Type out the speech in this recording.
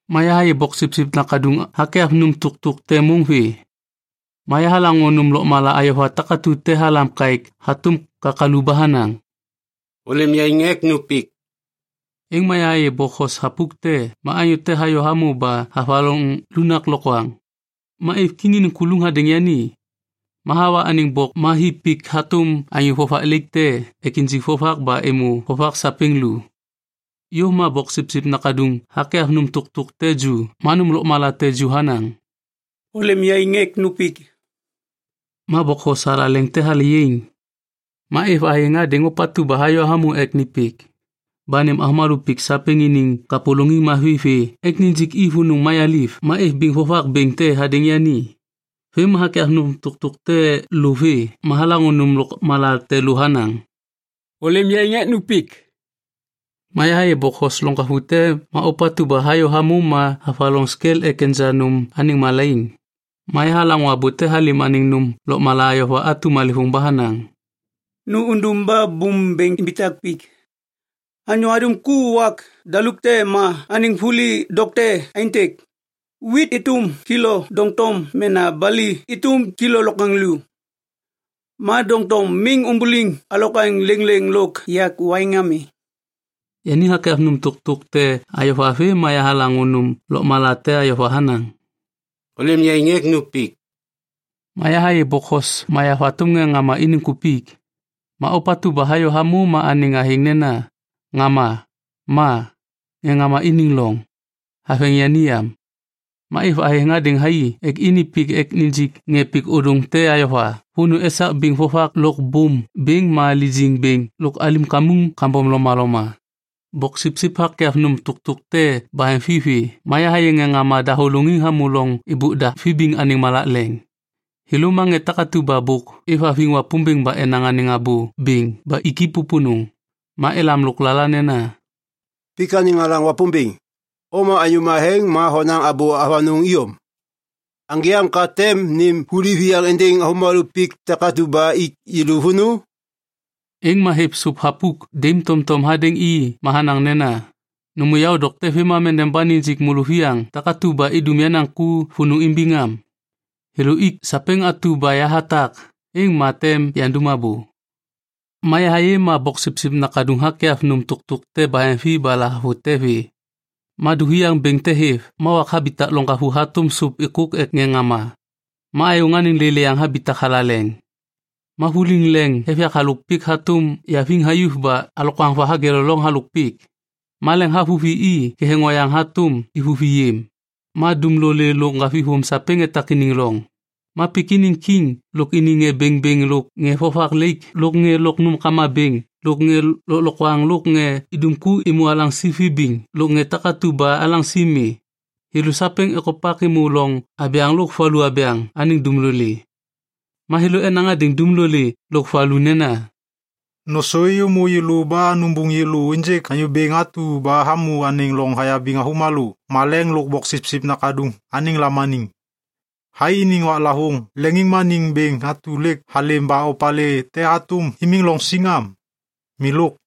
Ma yahayê Boksipsip Nakaduŋ hakyav nôm tôktôk te môŋ vê. Ma yahalaŋô nôm lôkmala ayova takatu te halam kaêk hatôm kakalu ba hanaŋ, “Ôlêm yaiŋ ek nu pik.” Êŋ ma yahayê bokhos thapuk te ma anyô te hayô hamô ba havaloŋ lunak lokwaŋ. Ma êv kiŋ iniŋ kuluŋ hadêŋ yani. Ma hawa anêŋ bok ma hi pik hatôm anyô vovak laik te ek injik vovak ba êmô vovak sapêŋ lu. Yôv ma Boksipsip Nakaduŋ hakyav nôm tôktôk te ju ma nôm lôkmala te ju hanaŋ, “Ôlêm yaiŋ ek nu pik.” Ma bokhos thalaleŋ te hale yaiŋ. Ma êv athêŋ hadêŋ ôpatu ba hayô hamô ek ni pik ba nêm avômalô pik sapêŋ iniŋ kapôlôŋiŋ mavi vê ek nijik i vônô mayaliv. Ma êv biŋ vovak bêŋ te hadêŋ yani. Vêm ma hakyav nôm tôktôk te lô vê ma yahalaŋô nôm lôkmala te lô hanaŋ, “Ôlêm yaiŋ ek nu pik.” Ma yahayê bokhos loŋgavu te ma ôpatu ba hayô hamô ma havaloŋ skel ek enja nôm anêŋ malaiŋ. Ma yahalaŋô abô te halêm anêŋ nôm lôkmala ayova atu malêvôŋ ba hanaŋ, “Nu undum ba bôm bêŋ imbitak pik. Anyô hadum ku wak daluk te ma anêŋ vuli dokte aêntêk: wit êtôm kilo doŋtom mena bali êtôm kilo lokwaŋlô. Ma doŋtom miŋ umbuliŋ alokwaŋ lêŋlêŋ lôk yak waiŋ ami.” Yani hakyav nôm tôktôk te ayova vê ma yahalaŋô nôm lôkmala te ayova hanaŋ, “Ôlêm yaiŋ ek nu pik.” Ma yahayê bokhos mayav hatôm ŋê ŋama iniŋ kupik. Ma ôpatu ba hayô hamô ma anêŋ athêŋ nena, “Ŋama” ma “Ŋê Ŋama Iniŋ Loŋ” haveŋ yani yam. Ma êv athêŋ hadêŋ thai ek ini pik ba nijik ŋê pik ôdôŋ te ayova vônô esak biŋ vovak lôk bôm bêŋ ma lijiŋ bêŋ lôk alim kamuŋ kambom lomaloma. Boksipsip hakyav nôm tôktôk te baheŋvi vê ma yahayê ŋê ŋama dahôlôŋiŋ hamô loŋ êbôk da vibiŋ anêŋ malak leŋ. Thêlô ma ŋê takatu ba bôk êvhaviŋ Wapômbêŋ ba enaŋ anêŋ abô bêŋ ba ik i pôpônô. Ma elam lôklala nena, “Pik anêŋ alaŋ Wapômbêŋ, o ma anyô matheŋ ma honaŋ abô avanôŋ iyom. Aŋgê am ka tem nêm vuli viyaŋ êndêŋ avômalô pik takatu ba ik yêlô vônô?” Êŋ ma hêv sôp thapuk daim tomtom hadêŋ i ma hanaŋ nena, “Nômô yaô dokte vêmam endeba nijik môlôviyaŋ takatu ba idum yenaŋ ku vônô imbiŋ am. Thêlô ik sapêŋ atu ba yahatak, êŋ ma tem yandum abô.” Ma yahayê ma Boksipsip Nakaduŋ hakyav nôm tôktôk te baheŋvi ba lahavute vê. Ma duviaŋ bêŋ te hêv ma wak habitak loŋgavu hatôm sôp êkôk ek ŋê ŋama. Ma ayôŋ anêŋ lêlêyaŋ habitak thalaleŋ. Ma vuliŋ leŋ êv yak halôk pik hatôm yaviŋ hayuv ba alokwaŋ va hageleloŋ halôk pik. Ma leŋ havuvi i ketheŋ oyaŋ hatôm ivuvi yêm. Ma dumlolê lôk ŋgavithôm sapêŋ etak iniŋ loŋ. Ma pik iniŋ kiŋ lôk iniŋ ŋê bêŋbêŋ lôk ŋê vovak laik lôk ŋê lôk nômkama bêŋ lôk ŋê lôklokwaŋ lôk ŋê idum ku êmô alaŋsi vibiŋ lôk ŋê takatu ba alaŋsi mi, thêlô sapêŋ ekopak êmô loŋ abyaŋ lôk valu abyaŋ anêŋ dumlolê. Ma thêlô enaŋ hadêŋ dumlolê lôk valu nena, “Nôsô êyômô yêlô ba nubuŋ yêlô ênjêk Anyô Bêŋ atu ba hamô anêŋ loŋ hayabiŋ avômalô maleŋ lôk Boksipsip Nakaduŋ anêŋ lamaniŋ. Thai iniŋ waklavôŋ leŋiŋmaniŋ bêŋ atu lêk halêm ba opalê te hatôm imiŋ loŋ siŋ am? Milôk.”